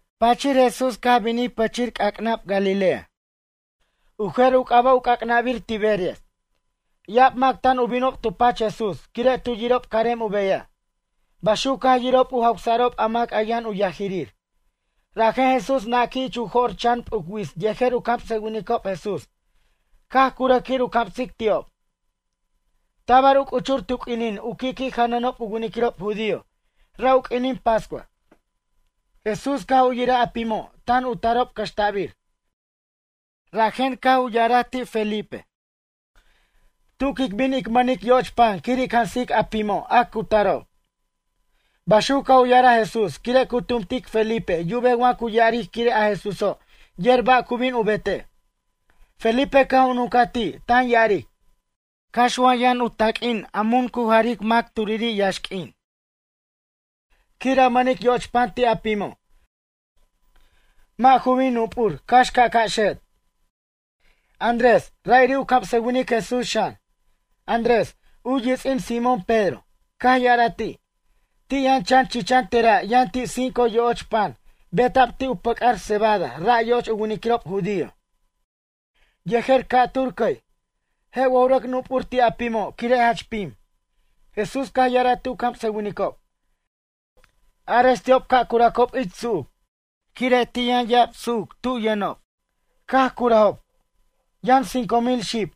Pachir Jesús caj binij pichij c'ac'nab Galilea. U jer u c'aba' u c'ac'nabir Tiberias. Ya'ab mac tan u binob tu pach Jesús quire' tu yirob carem u beyaj. Baxuc caj yirob u jawsa'rob a mac yʌn u yajirir. Rajen Jesús naquij ich u jo'r chan p'uc wits yejer u camsʌwinicob Jesús caj curʌj quir u camsic ti'ob. Tabar u c'uchur tu q'uinin u qui'qui' janʌnob u winiquirob judío ra' u q'uinin pascua. Jesús caj u yiraj a pimo' tan u tarob cʌxta'bir. Rajen caj u ya'araj ti' Felipe: ―Tu quic bin ic mʌnic yoch pan quir ic jansic a pimo' a cu tarob. Baxuc caj u ya'araj Jesús quire' cu tumtic Felipe yubej ba' cu ya'aric quire' a Jesúso' yer ba' cu bin u betej. Felipe caj u nuncaj ti' tan ya'aric: ―Cax wa yʌn u taq'uin a mun cu jaric mac turiri' yaxq'uin, quir a mʌnic yoch pan ti' a pimo', mʌ' ju bin nup'ur cax ca'ca' xet'. Andrés, ra'iri' u camsʌwinic Jesús xan. Andrés, u yits'in Simón Pedro, caj ya'araj ti': ―Ti' yʌn chan chichan tera' yʌn ti' cinco yo'och pan beta'b ti' u pʌc'ar cebada ra' yoch u winiquirob judío. Yejer ca'tur cʌy. Je' wa ju rʌc nup'ur ti' a pimo' quire' jach pim? Jesús caj ya'araj ti' u camsʌwinicob: ―Arex ti'ob ca' curacob ich su'uc. Quire' ti' yʌn ya'ab su'uc tub yʌnob. Caj curʌjob, yʌn cinco mil xib.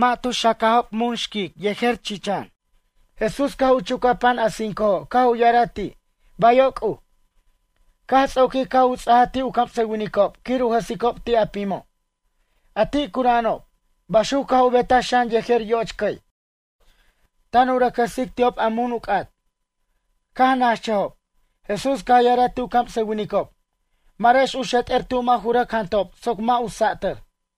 Mʌ' tu xacajob mun xquic yejer chichan. Jesús caj u chucaj pan a cincojo' caj u ya'araj ti': ―Bayo' C'uj. Caj ts'oqui' caj u ts'aja ti' u camsʌwinicob quir u jʌsicob ti' a pimo', a ti' cura'anob. Baxuc caj u betaj xan yejer yoch cʌy, tan u rʌc jʌsic ti'ob a mun u c'at. Caj nachʌjob. Jesús caj ya'araj ti' u camsʌwinicob: ―Marex u xet'er tu' mʌ' ju rʌc jantob soc mʌ' u sa'atʌr.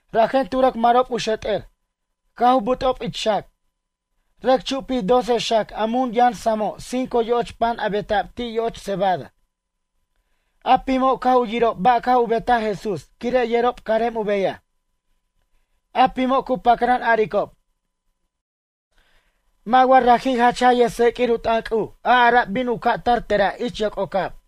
Rajen tu rʌc marob u xet'er. Caj u but'ob ich xac, rʌc chupij doce xac a mun yʌn samo' cinco yoch pan a beta'b ti' yoch cebada. A pimo' caj u yirob ba' caj u betaj Jesús quire' yerob carem u beyaj. A pimo' cu pacran aricob: ―Mʌ' wa raji' jach jaj yʌjtseq'uir u t'ʌn C'uj a ara'b bin u ca' tar tera' ich yoc'ocab?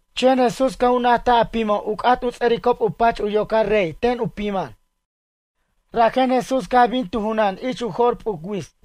Chen Jesús caj u najtaj a pimo' u c'at u ts'ʌricob u pach u yocar rey ten u piman. Rajen Jesús caj bin tu junan ich u jo'r p'uc wits.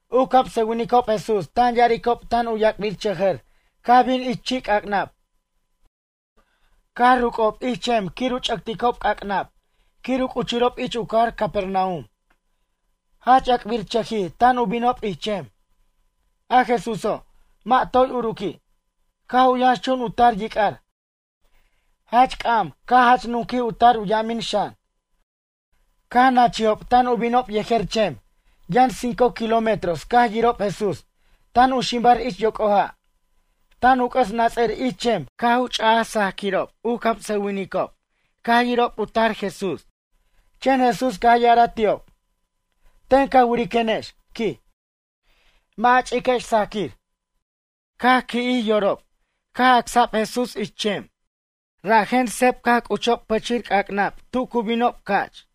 U camsʌwinicob Jesús tan yiricob tan yac'birchʌjʌr caj bin ich chi' c'ac'nab. Caj ruc'ocob ich chem quir u ch'ʌcticob c'ac'nab quir u c'uchurob ich u cajar Capernaum. Jach ac'birchʌjij tan u binob ich chem. A Jesúso', mʌ' toy uruqui'. Caj u yʌnxchun u tar yic'ar. Jach c'am caj jach nuquij u tar u yamin xan. Caj nachijob tan u binob yejer chem. Yʌn cinco kilómetros caj yirob Jesús. Tan u ximbar ich yoc'o ja', tan u c'ʌs nats'ʌr ich chem caj u ch'aj sajquirob u camsʌwinicob caj yirob u tar Jesús. Chen Jesús caj ya'araj ti'ob: ―Ten ca wiriquenex ―quij―, mʌ' a ch'iquex sajquir. Caj qui'jij yorob caj acsa'b Jesús ich chem. Rajen seb caj c'uchob pichij c'ac'nab tu cu binob ca'ch.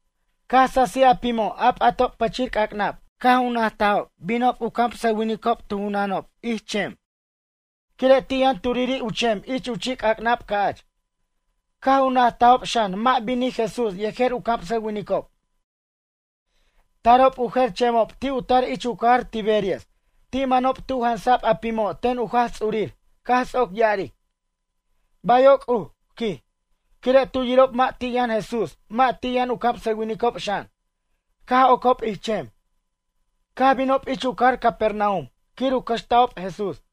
Caj sasij a pimo' a p'atob pichir c'ac'nab caj u najtob binob u camsʌwinicob tu junanob ich chem. Quire' ti' yʌn turiri' u chem ich chi' c'ac'nab ca'ch. Caj u najtob xan mʌ' binij Jesús yejer u camsʌwinicob. Tarob u jer chemob ti' u tar ich u cajar Tiberias ti' manob tu' jansa'b a pimo' ten u Jaj Ts'urir caj ts'oc ya'aric: ―Bayo' C'uj ―quij. Quire' tu yirob mʌ' ti' yʌn Jesús mʌ' ti' yʌn u camsʌwinicob xan. Caj ocob ich chem. Caj binob ich u cajar Capernaum quir u cʌxta'ob Jesús.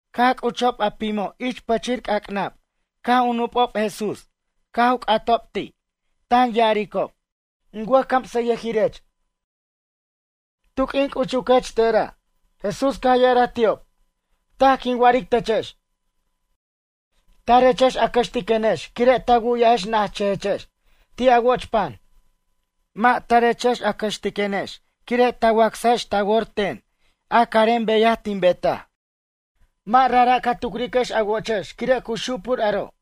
Caj c'uchob a pimob ich pichi c'ac'nab caj u nup'ob Jesús caj u c'atob ti', tan ya'aricob: ―In wʌjcamsʌyʌjirech, tu' q'uin c'uchuquech tera'? Jesús caj ya'araj ti'ob: ―Taj quin wa'aric techex. Tarechex a cʌxtiquenex quire' ta wu'yajex najchʌjechex ti' a woch pan. Mʌ' tarechex a cʌxtiquenex quire' ta wacsajex ta wor ten a carem beyaj tin betaj. Mʌ' rajra' ca tucriquex a wochex quire' cu xupur aro'.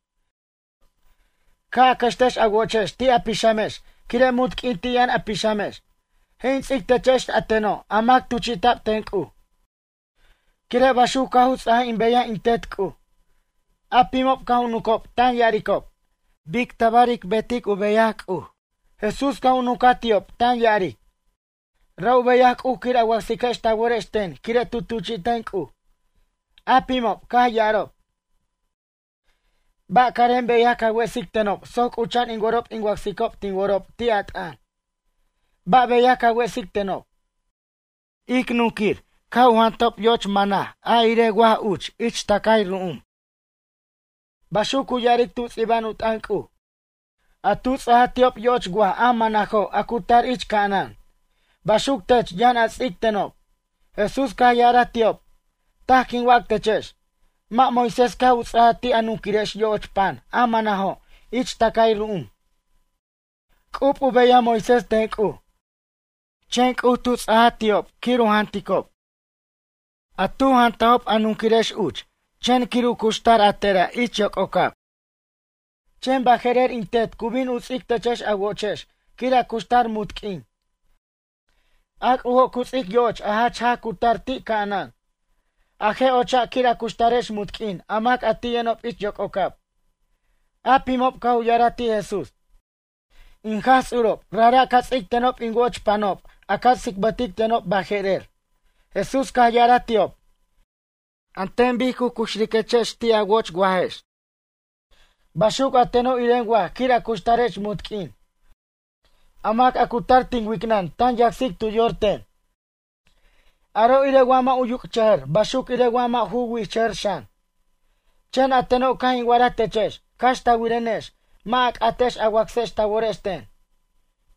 Ca' a cʌxtex a wochex ti' a pixamex quire' munt q'uin ti' yʌn a pixamex. Je' in ts'ic techex a teno' a mac tuchi'ta'b ten C'uj. Quire' baxuc caj u ts'aj in beyaj in Tet C'uj. A pimob caj u nuncob tan ya'aricob: ―Bic tabar ic betic u beyaj C'uj? Jesús caj u nuncaj ti'ob tan ya'aric: ―Ra' u beyaj C'uj quir a wacsiquex ta worex ten quire' tu tuchi'ten C'uj. A pimob caj ya'arob: ―Ba' carem beyaj ca wesic tenob soc c'ucha'an in worob in wacsicob tin worob ti' a t'ʌn? Ba' beyaj ca wesic tenob? Ic nunquir caj u jantob yoch mana a irej waj uch ich tacay ru'um. Baxuc cu ya'aric tu ts'iba'an u t'ʌn C'uj: “A tu ts'aj ti'ob yoch waj a manajo' a cu tar ich ca'anan. Baxuc tech yʌn a ts'ic tenob.” Jesús caj ya'araj ti'ob: ―Taj quin wac techex. Mʌ' Moisés caj u ts'aja ti' a nunquirex yoch pan a manajo' ich tacay ru'um. C'ub u beyaj Moisés ten C'uj. Chen C'uj tu ts'aj ti'ob quir u janticob. A tu jantajob a nunquirex uch chen quir u cuxtar a tera' ich yoc'ocab. Chen baje'rer in Tet cu bin u ts'ic techex a wochex quir a cuxtar munt q'uin. A C'ujo' cu ts'ic yo'och a jach jaj cu tar ti' ca'anan. A je' ocha' quir a cuxtarex munt q'uin a mac a ti' yʌnob ich yoc'ocab. A pimob caj u ya'araj ti' Jesús: ―In Jaj Ts'urob rajra' ca ts'ic tenob in woch panob a ca tsicbʌtic tenob baje'rer. Jesús caj ya'araj ti'ob: ―An ten bic cu cuxriquechex ti' a wo'och wajex. Baxuc a teno' iren waj quir a cuxtarex munt q'uin. A mac a cu tar tin wicnʌn tan yacsic tu yor ten. Aro' irej wa mʌ' u yuc'chʌjʌr baxuc irej wa mʌ' ju wi'chʌjʌr xan. Chen a teno' caj in wa'araj techex cax ta wirenex mʌ' a c'atex a wacsex ta worex ten.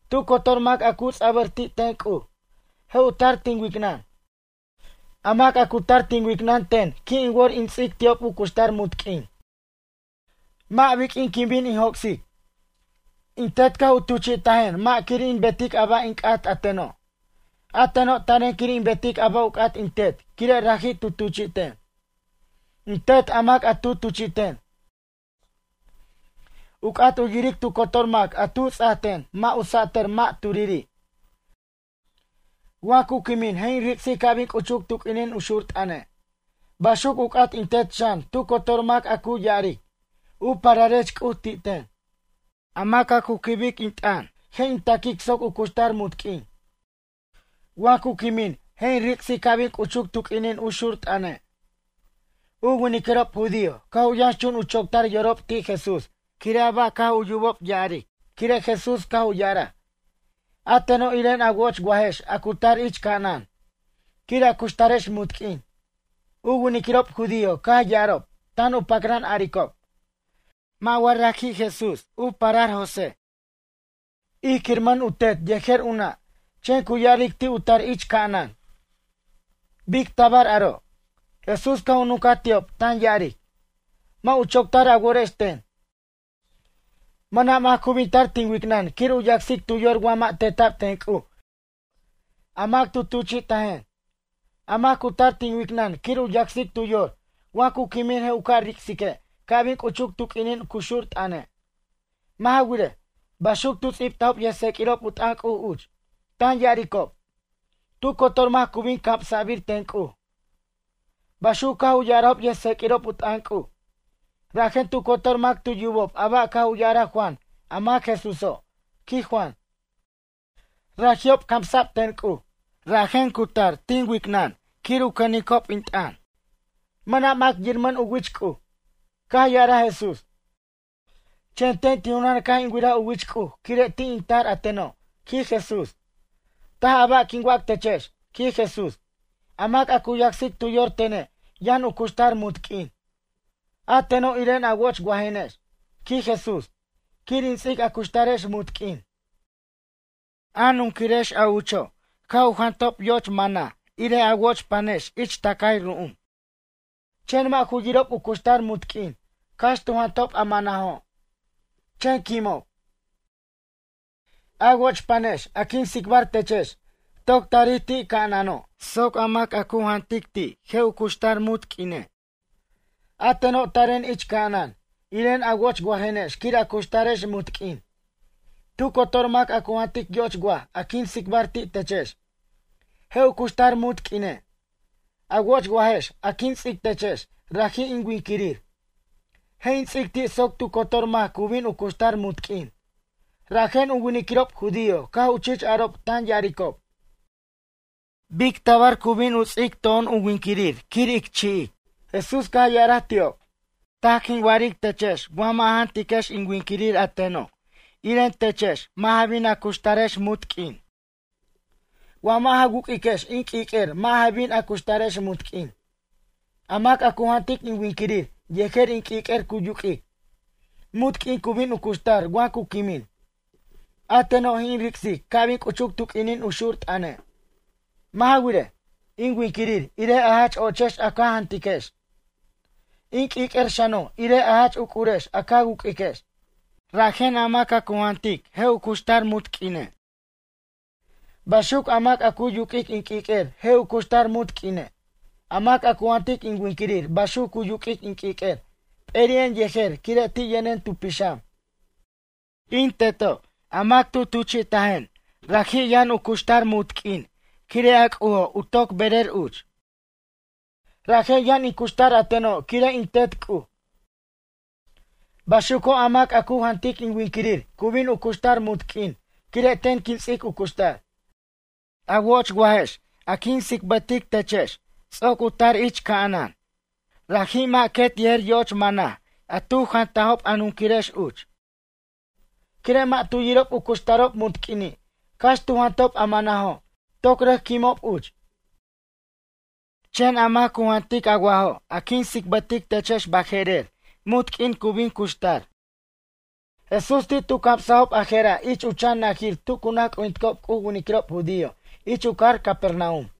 Tu cotor mac a cu ts'abʌr ti' ten C'uj. Je' u tar tin wicnʌn. A mac a cu tar tin wicnʌn ten qui' in wor in ts'ic ti'ob u cuxtar munt q'uin. Mʌ' biq'uin quin bin in joc'sic. In Tet caj u tuchi'tajen mʌ' quir in betic a ba' in c'at a teno'. A teno' taren quir in betic a ba' u c'at in Tet quire' raji' tu tuchi'ten. In Tet a mac a tu tuchi'ten, u c'at u yiric tu cotor mac a tu ts'ajten mʌ' u sa'tʌr mʌ' turiri'. Wa cu quimin je' in ric'sic ca' bin c'uchuc tu q'uinin u xur t'ʌne'. Baxuc u c'at in Tet xan tu cotor mac a cu ya'aric: “U pararech C'uj” ti' ten. A mac a cu quibic in t'ʌn je' in taquic soc u cuxtar munt q'uin. Wa cu quimin je' in ric'sic ca' bin c'uchuc tu q'uinin u xur t'ʌne'. U winiquirob judío caj u yʌnxchun u choctar yorob ti' Jesús quire' a ba' caj u yubob ya'aric quire' Jesús caj u ya'araj: “A teno' iren a woch wajex a cu tar ich ca'anan quir a cuxtarex munt q'uin.” U winiquirob judío caj ya'arob; tan u pacran aricob: ―Mʌ' wa raji' Jesús, u parar José? Ij quiramʌn u tet yejer u nʌ'. Chen cu ya'aric ti' u tar ich ca'anan. Bic tabar aro'? Jesús caj u nuncaj ti'ob tan ya'aric: ―Mʌ' u choctar a worex ten. Mʌna' mac cu bin tar tin wicnʌn quir u yacsic tu yor wa mʌ' teta'b ten C'uj a mac tu tuchi'tajen. A mac cu tar tin wicnʌn quir u yacsic tu yor wa cu quimin je' in ca' ric'sique' ca' binin c'uchuc u q'uinin cu xur t'ʌne'. Mʌ' ja wirej, baxuc tu ts'ibtajob yʌjtseq'uirob u t'ʌn C'uj uch, tan ya'aricob: “Tu cotor mac cu bin camsabir ten C'uj.” Baxuc caj u ya'arajob yʌjtseq'uirob u t'ʌn C'uj. Rajen tu cotor mac tu yubob a ba' caj u ya'araj Juan a mac Jesúso', quij Juan. Raji'ob camsa'b ten C'uj, rajen cu tar tin wicnʌn quir u cʌnicob in t'ʌn. ’Mʌna' mac yiramʌn u wich C'uj. Caj ya'araj Jesús. Chen ten tin junan caj in wiraj u wich C'uj quire' ti' in tar a teno' ―quij Jesús―. Taj a ba' quin wac techex ―quij Jesús―, a mac a cu yacsic tu yor tene' yʌn u cuxtar munt q'uin. A teno' iren a woch wajenex ―quij Jesús―, quir in ts'ic a cuxtarex munt q'uin. A nunquirex a ucho' caj u jantob yoch mana irej a woch panex ich tacay ru'um. Chen mʌ' ju yirob u cuxtar munt q'uin cax tu jantajob a manajo', chen quimob. A woch panex a quin tsicbar techex, toc tarij ti' ca'anano' soc a mac a cu jantic ti' je' u cuxtar munt q'uine'. A teno' taren ich ca'anan, iren a woch wajenex quir a cutarex munt q'uin. Tu cotor mac a cu jantic yoch waj a quin tsicbar ti' techex, je' u cuxtar munt q'uine'. A woch wajex a quin ts'ic techex raji' in winquirir. Je' in ts'ic ti' soc tu cotor mac cu bin u cuxtar munt q'uin. Rajen u winiquirob judío caj u chich arob tan ya'aricob: ―Bic tabar cu bin u ts'ic to'on u winquirir quir ic chi'ic? Jesús caj ya'arj ti'ob: ―Taj quin wa'aric techex wa mʌ' a jantiquex in winquirir a teno' iren techex mʌ' ja bin a cuxtarex munt q'uin. Wa mʌ' ja wuq'uiquex in q'uiq'uer mʌ' ja bin a cuxtarex munt q'uin. A mac a cu jantic in winquirir yejer in q'uiq'uer cu yuq'uic, munt q'uin cu bin cuxtar wa cu quimin. A teno' je' in ric'sic ca' bin c'uchuc tu q'uinin u xur t'ʌne'. Mʌ' ja wirej, in winquirir irej a jach ochex a ca jantiquex. In q'uiq'uer xano' irej a jach uc'urex a ca wuq'uiquex. Rajen a mac a cu jantic je' u cuxtar munt q'uine'. Baxuc a mac a cu yuq'uic in q'uiq'uer je' u cuxtar munt q'uine'. A mac a cu jantic in winquirir baxuc cu yuq'uic in q'uiq'uer p'eri'en yejer quire' ti' yʌnen tu pixam. In Teto' a mac tu tuchi'tajen raji' yʌn u cuxtar munt q'uin quire' a C'ujo' toc berer uch. Rajen yʌn in cuxtar a teno' quire' in Tet C'uj. Baxuco' a mac a cu jantic in winquirir cu bin u cuxtar munt q'uin quire' ten quin ts'ic u cuxtar. A woch wajex a quin tsicbʌtechex ts'oc u tar ich ca'anan. Raji' mʌ' quet yejer yoch mana a tu jantob a nunquirex uch. Quire' mʌ' tu yirob u cuxtarob munt q'uini' cax tu jantob a manajo' toc rʌc quimob uch. Chen a mac cu jantic a wajo' a quin tsicbʌtechex baje'rer munt q'uin cu bin cuxtar. Jesús ti' tu camsajob a jera' ich u chan najir tu cu naj c'ujinticob C'uj u winiquirob judío ich u cajar Capernaum.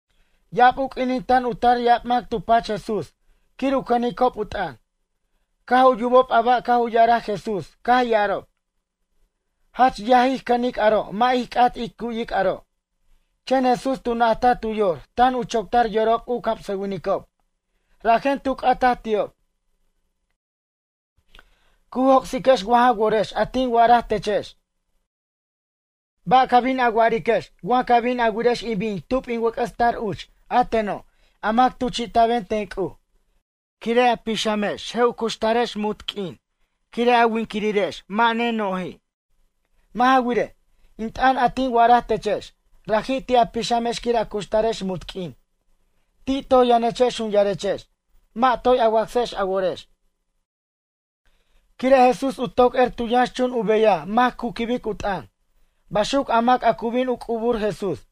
Ya'ab u q'uinin tan u tar ya'ab mac tu pach Jesús quir u cʌnicob u t'ʌn. Caj u yubob a ba' caj u ya'araj Jesús caj ya'arob: ―Jach yaj ij cʌnic aro' mʌ' ij c'at ij cu'yic aro'. Chen Jesús tu najtaj tu yor tan u choctar yorob u camsʌwinicob. Rajen tu c'ataj ti'ob: ―Cu joc'siquex wa ja worex a tin wa'araj techex? Ba' ca bin a wa'ariquex wa ca' bin a wirex in bin tub in wʌc'ʌs tar uch a teno' a mac tuchi'ta'ben ten C'uj? Quire' a pixamex je' u cuxtarex munt q'uin quire' a winquirirex mʌ' neno'ji'. Mʌ' ja wirej, in t'ʌn a tin wa'araj techex, raji' ti' a pixamex quir u cuxtarex munt q'uin. Ti' toj yʌnechex jun yarechex, mʌ' toy a wacsex a worex. Quire' Jesús u toc er tu yʌnxchun u beyaj mac cu quibic u t'ʌn, baxuc a mac a cu bin u c'ubur Jesús.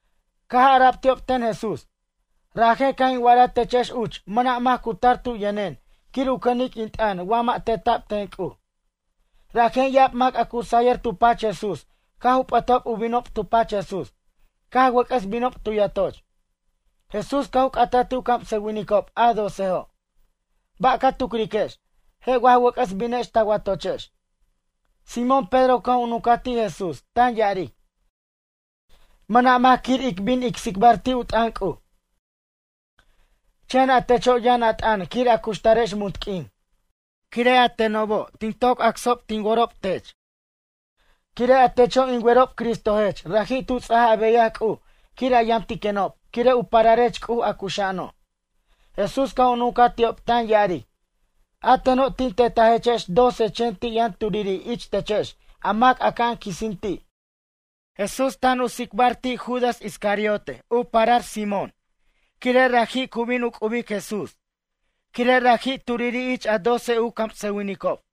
Caj ara'b ti'ob ten Jesús: ―Rajen caj in wa'araj techex uch mʌna' mac cu tar tu yʌnen quir u cʌnic in t'ʌn wa mʌ' teta'b ten C'uj. Rajen ya'ab mac a cu sayʌr tu pach Jesús caj u p'ʌtob u binob tu pach Jesús caj wʌc'ʌs binob tu yatoch. Jesús caj u c'ataj ti' u camsʌwinicob a docejo': ―Ba' ca tucriquex? Je' wa ja wʌc'ʌs binex ta watochex? Simón Pedro caj u nuncaj ti' Jesús tan ya'aric: ―Mʌna' mac quir ic bin ic tsicbar ti' u t'ʌn C'uj. Chen a techo' yʌn a t'ʌn quir ij cuxtarex munt q'uin. Quire' a tenobo' tin toc wacsob tin worob tech. Quire' a techo' in werob Cristojech raji' tu ts'aj a beyaj C'uj quir a yamtiquenob quire' u pararech C'uj a cuxa'ano'. Jesús caj u nuncaj ti'ob tan ya'aric: ―A teno' tin tetajechex doce chen ti' yʌn turiri' ich techex a mac aca'an quisin ti'. Jesús tan u tsicbar, ti' Judas u parar Simón Iscariote quire' raji' cu bin u c'ubic Jesús. Quire' raji' turiri' ich a doce u camsʌwinicob.